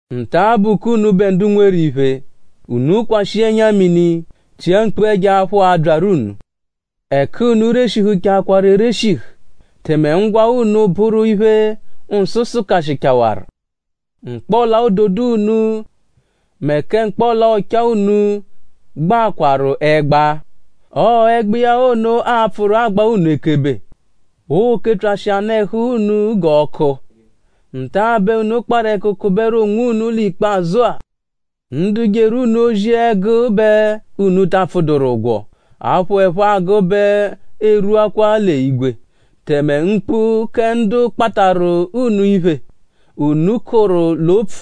Nta-a bụ k'unubẹ ndu nweru iphe; unu kwashịa ẹnya-mini; chia mkpu ẹjo-aphụ, abyaru unu. Ẹku unu reshihuchaakwaru ereshihu. Tẹme ńgwá unu bụru iphe, nsụ sụkashichawaru. Mkpọla-ododo unu mẹ kẹ mkpọla-ọchaa unu gbaakwaru ẹgba. Ọo ẹgba iya ono a-pfụru agba unu ekebe. Oo-kepyashị anụ-ẹhu unu g'ọku. Nta-a bẹ unu kparụ ẹku kụberu onwunu l'ikpazụ-a. Ndu jeru unu ozi ẹgu bẹ unu ta apfụduru ụgwo; aphụ, ẹphe agụ bẹ erwuakwa l'igwe. Tẹme mkpu kẹ ndu kpatarụ unu iphe, unu kọru l'opfu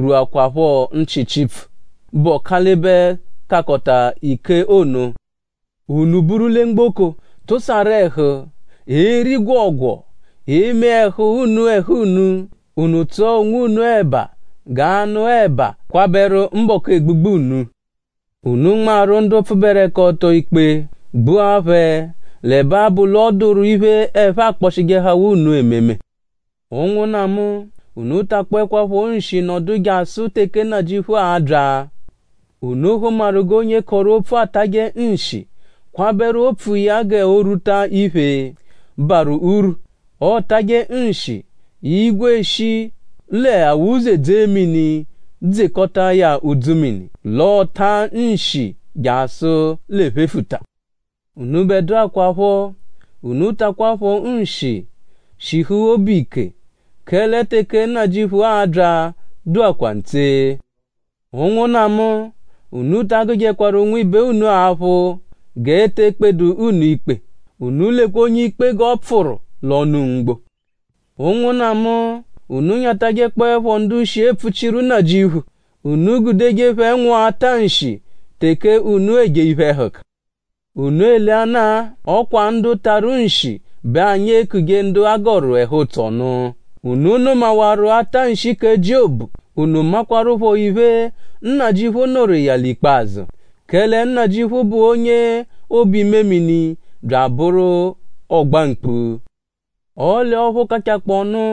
rwuakwaphọ nchị Chipfu, bụ Ọkalibe-Kakọta-ike ono. Unu buru lẹ mgboko; tụsaru ẹhu; eri gwọogwoo; eme ẹhu unu ẹhu unu. Unu tsụa onwunu ẹ̀bà g'anụ-ẹ̀bà kwabẹru mbọku egbugbu unu. Unu nmarụ ndu pfụberekoto ikpe; gbua phẹ; l'ẹbe abụ l'ọ dụru iphe, ẹphe akpọshijehawaa unu ememe. Ụnwunna mu; unu takpọekwapho nshi nọdu jasụ teke Nnajịuphu a-bya. Unu hụmaru g'onye kọru opfu atajẹ nshi; kwabẹru opfu iya g'o rwuta iphe, barụ urwu. Ọotaje nshi; igwe eshi l'awuze dzee mini dzekọta iya udzumini; l'ọotaa nshi jasụ l'ephefuta. Unubẹdua kwaphọ; unu takwaphọ nshi; shihu obu ike; kẹle teke Nnajịuphu a-bya dụakwaa ntse. Ụnwunna mu; unu ta agụjekwaru nwibe unu aphụ g'eete ekpedu unu ikpe. Unu lekwa onye-ikpe g'ọopfuru l'ọnu mgbo! Ụnwunna mu; unu nyatajẹkpoepho ndu shi epfuchijeru Nnajịuphu. Unu gudeje phẹ nwụa ọta-nshi teke unu eje iphe-ẹhuka. Unu eleanaa; ọ kwa ndu tarụ nshi bẹ anyi ekuje ndu a gọru ẹhu-ụtso nụ. Unu nụmawaru atanshi kẹ Jiobu. Unu makwaruphọ iphe, Nnajịuphu nụru iya l'ikpazụ. Kẹle Nnajịuphu bụ onye obu-imemini bya abụru ọ-gba-mkpu. Ọle ọphu kachakpọonu;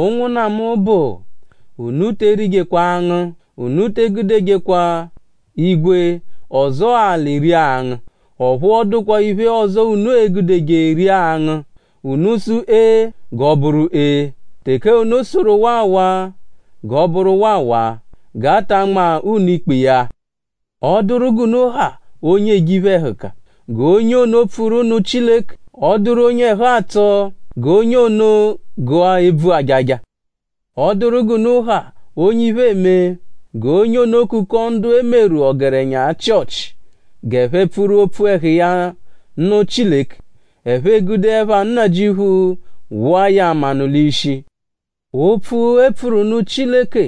ụnwunna mu bụ; unu te erijekwa angụ. Unu te egudejekwa igwe ọzoo alị ria angụ; ọphu ọ dụkwa iphe ọzo unu e-gudeje ria angụ. Unu -sụ “ee” g'ọ bụru ee; teke unu sụru “waawaa” g'ọ bụru waawaa; g'a ta anma unu ikpe iya. ?Ọ dụru g'unu ha onye eje iphe-ẹhuka? G'onye ono pfuru nụ Chileke.?Ọ dụru onye ẹhu atsọ? G'onye ono gụa ebvu ajaja! ?Ọ dụru g'unu ha onye iphe eme? G'onye ono kukọo ndu e meru ọgerenya Chịochi g'ẹphe pfuru opfu ẹhu iya nụ Chileke. Ẹphe egude ẹpha Nnajịuphu wụa ya manụ l'ishi. Opfu, e pfuru nụ Chileke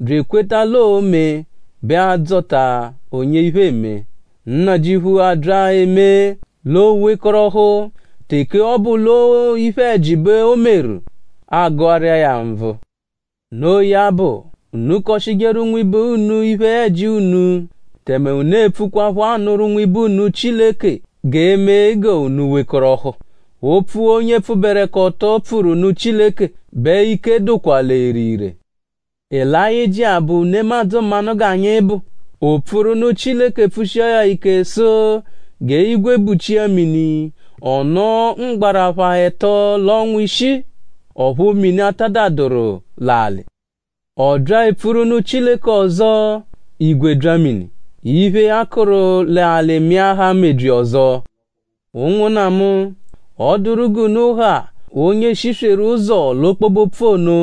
bya ekweta l'oo-mee bẹ a-dzọta onye iphe eme; Nnajịuphu abya emee; l'o wekọrohu. Teke ọ bụ l'ọo iphe-ẹji bẹ o meru; a gụaru iya ya nvụ. Noo ya bụ; unu kọshijeru nwibe unu iphe-ẹji unu; tẹme unu epfukwaphọ anụru nwibe unu Chileke g'ee-me g'unu wekọrohu. Opfu, onye pfụberekoto pfuru nụ Chileke bẹ ike dụkwa l'ere ire. Elayịjia bụ nemadzụ mmanụ g'anyi bụ. O pfuru nụ Chileke pfushia ya ike sụ g'igwe buchia mini. Ọ nọo mgbarapha ẹto l'ọnwa ishii; ọphu mini atadaduru l'alị. Ọ bya epfuru nụ Chileke ọzo; igwe bya mini. Iphe, a kụru l'alị mịahaa mebyi ọzo. Ụnwunna mu; ọ -dụru g'unu ha onye shisweru ụzo l'ọkpobe-opfu ono;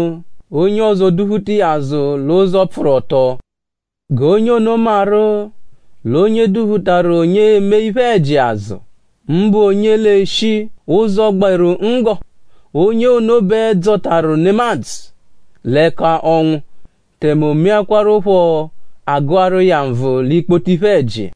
onye ọzo duphuta iya azụ l'ụzo, pfụru ọto; g'onye ono maru l'onye duphutaru onye eme iphe-ẹji azụ; mbụ onye l'eshi ụzo, gberu nggọ; onye ono bẹ dzọtaru nemadzụ l'ẹka ọnwu; tẹme o meakwaruphọ; a gụaru iya nvụ l'ikpoto iphe-ẹji.